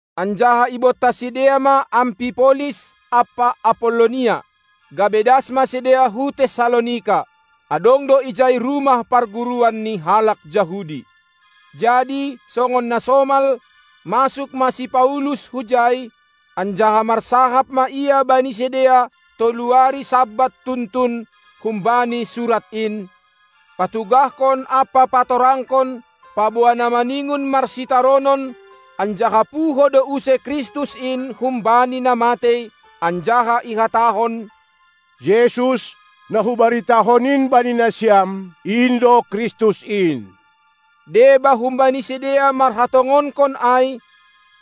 Anjaha ibontas sidea ma Ampipolis ampa Apollonia, gabe das ma sidea hu Tessalonika. Adong do ijai rumah parguruan ni halak Jahudi. Jadi songon na somal, masuk ma si Paulus hujai, anjaha marsahap ma ia bani sidea tolu ari Sabat tuntun humbani surat in, patugahkon ampa patorangkon, paboa na maningon marsitaronon anjaha puho do use Kristus in humbani na matei, anjaha ihatahon: Jesus, na hubaritahon in bani nasiam, in do Kristus in. Deba humbani sidea marhatongonkon ai,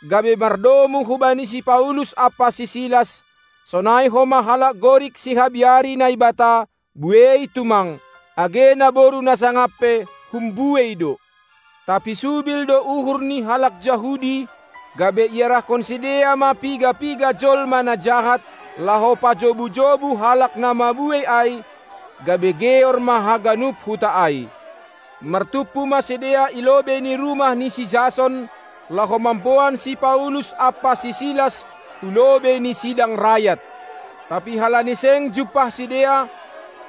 gabe mardomu hubani si Paulus ampa si Silas; sonai homa halak Gorik sihabiari Naibata, buei tumang, age naboru na sangap pe humbuei do. Tapi subil do uhur ni halak Jahudi, gabe iarahkon sidea ma piga-piga jolma na jahat laho pajobu-jobu halak na mabuei ai, gabe geor ma haganup huta ai. Martumpu ma sidea i lobei ni rumah ni si Jason laho mamboan si Paulus ampa si Silas hu lobei ni sidang rayat. Tapi halani seng jumpah sidea,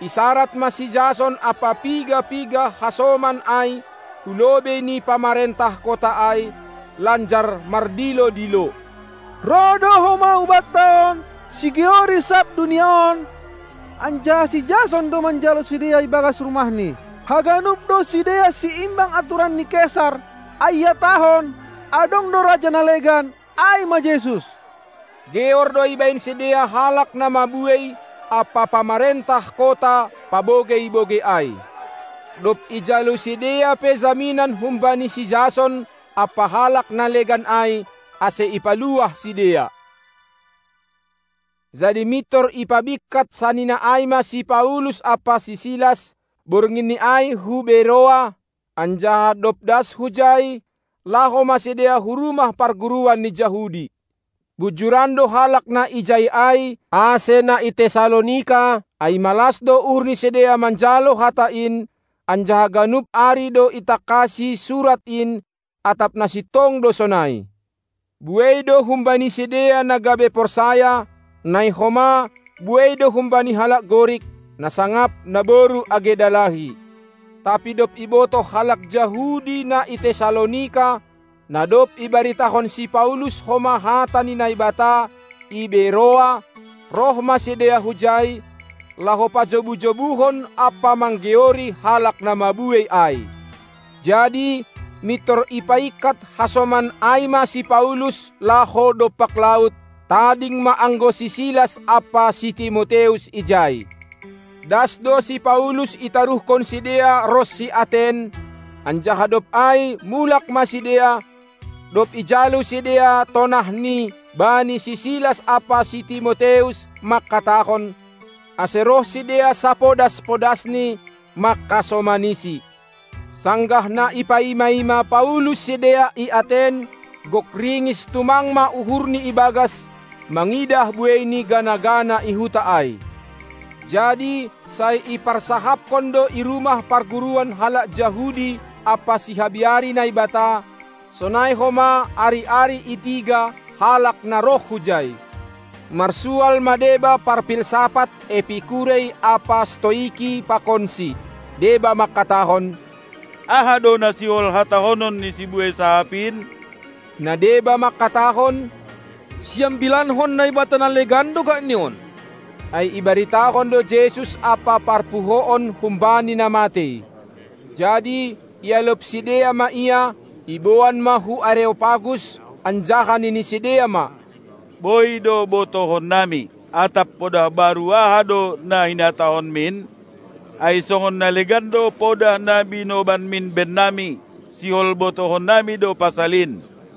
isarad ma si Jason ampa piga-piga hasoman ai hu lobei ni pamarentah kota ai, lanjar mardilo-dilo: Roh do homa hubanta on sigeori sab dunia on, anjaha si Jason do manjalo sidea ibagas rumahni. Haganup do sidea siimbang aturan ni Kesar, ai ihatahon, adong do raja na legan, ai ma Jesus. Geor do ibahen sidea halak na mabuei ampa pamarentah kota pabogei-bogei ai. Dob ijalo sidea pe jaminan humbani si Jason ampa halak na legan ai, ase ipaluah sidea. Jadi mintor ipabingkat sanina ai ma si Paulus ampa si Silas, bornginni ai hu Beroa, anjaha dob das hujai, laho ma sidea hu rumah parguruan ni Jahudi. Bujuran do halak na ijai ai ase na i Tessalonika, ai malas do uhur ni sidea manjalo hata in, anjaha ganup ari do itangkasi Surat in atap na sintong do sonai. Buei do humbani sidea na gabe porsaya, nai homa buei humbani halak Gorik, na sangap naboru age dalahi. Tapi dob ibotoh halak Jahudi na i Tessalonika, na dob ibaritahon si Paulus homa hata ni Naibata i Beroa, roh ma sidea hujai, laho pajobu-jobuhon ampa manggeori halak na mabuei ai. Jadi mintor ipaingkat hasoman ai ma si Paulus laho dompak laut; tading ma anggo si Silas ampa si Timoteus ijai. Das do si Paulus itaruhkon sidea ronsi Aten, anjaha dob ai mulak ma sidea, dob ijalo sidea tonahni bani si Silas ampa si Timoteus mangkatahon, ase roh sidea sapodas-podasni, mangkasomanisi. Sanggah na ipaima-ima Paulus sidea i Aten, gok ringis tumang ma uhurni ibagas, mangidah buei ni gana-gana i huta ai. Jadi sai iparsahapkon do i rumah parguruan halak Jahudi ampa sihabiari Naibata, sonai homa ari-ari i tiga halak na roh hujai. Marsual ma deba parpilsafah Epikurei ampa Stoiki pakonsi. Deba mangkatahon: Aha do na sihol hatahonon ni sibuei sahap in? Na deba mangkatahon: Siambilankon naibata na legan do gakni on, ai ibaritahon do Jesus ampa parpuhoon humbani na matei. Jadi ialop sidea ma ia, iboan ma hu Areopagus, anjaha nini sidea ma: Boi do botohonnami. Atap podah baru aha do na hinatahonmin? Ai songon na legan do podah na binobanmin bennami, sihol botohannami do pasal in.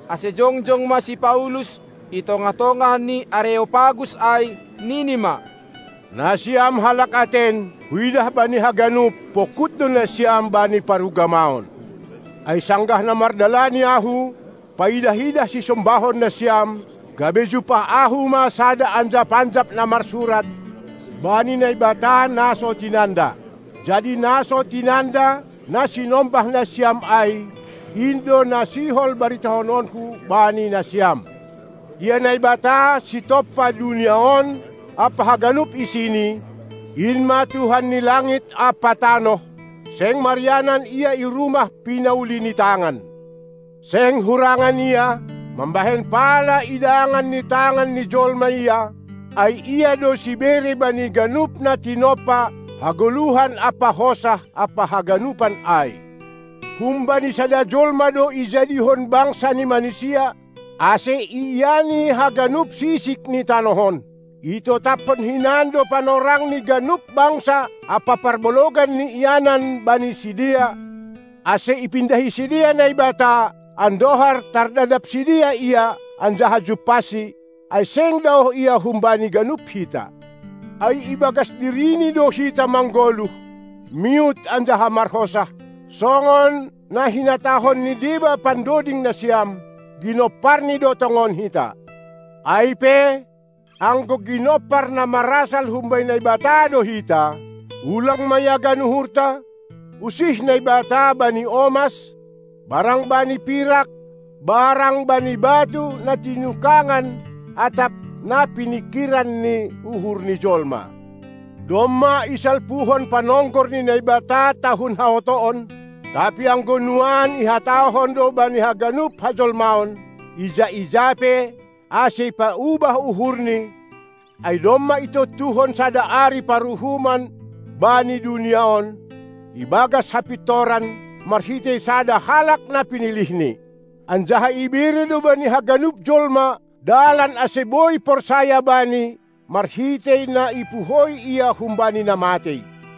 Ase jongjong ma si Paulus i tongah-tongah ni Areopagus ai, nini ma: Nasiam halak Aten, huidah bani haganup, pongkut do nasiam bani parugamaon. Ai sanggah na mardalani ahu, paidah-idah sisombahon nasiam, gabe jumpah ahu ma sada anjap-anjap na marsurat: Bani Naibata na so tinanda. Jadi na so tinanda, na sinombah nasiam ai, in do na sihol baritahononku bani nasiam. Ia Naibata, sitompa dunia on ampa haganup isini, in ma Tuhan ni langit ampa tanoh, seng marianan Ia i rumah pinauli ni tangan. Seng hurangan Ia, mambahen pala idangan ni tangan ni jolma Ia, ai Ia do sibere bani ganup na tinompa hagoluhan ampa hosah ampa haganupan ai. Humbani sada jolma do ijadihon bangsa ni manisia, ase iiani haganup sisik ni tanoh on. Itotaphon hinan do panorang ni ganup bangsa ampa parbalogan ni ianan bani sidea, ase ipindahi sidea Naibata, andohar tardadap sidea Ia, anjaha jumpahsi, ai seng daoh Ia humbani ganup hita. Ai ibagas diriNi do hita manggoluh, miut anjaha marhosah, songon na hinatahon ni deba pandoding nasiam: GinomparNi do tongon hita. Ai pe, anggo ginompar na marasal humbani Naibata do hita, ulang ma iagan uhurta, usih Naibata bani omas, barang bani pirak, barang bani batu na tinukangan atap na piningkiran ni uhur ni jolma. Domma isalpuhon panonggor ni Naibata tahun haotoon, tapi anggo nuan ihatahon do bani haganup hajolmaon, ija-ija pe, ase ipaubah uhurni, ai domma itontuhon sada ari paruhuman bani dunia on, ibagas hapintoran, marhitei sada halak na pinilihNi. Anjaha ibere do bani haganup jolma dalan ase boi porsaya Bani, marhitei na ipuhoi Ia humbani na matei.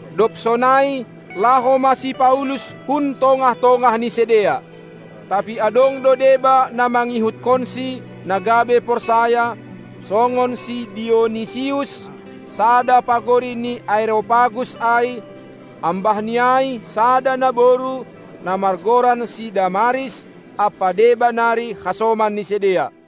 Dob sonai, laho ma si Paulus hun tongah-tongah ni sidea. Tapi adong do deba na mangihutkonsi, na gabe porsaya, songon si Dionisius, sada pagori ni Areopagus ai, ambah ni ai sada naboru, na margoran si Damaris, ampa deba nari hasoman ni sidea.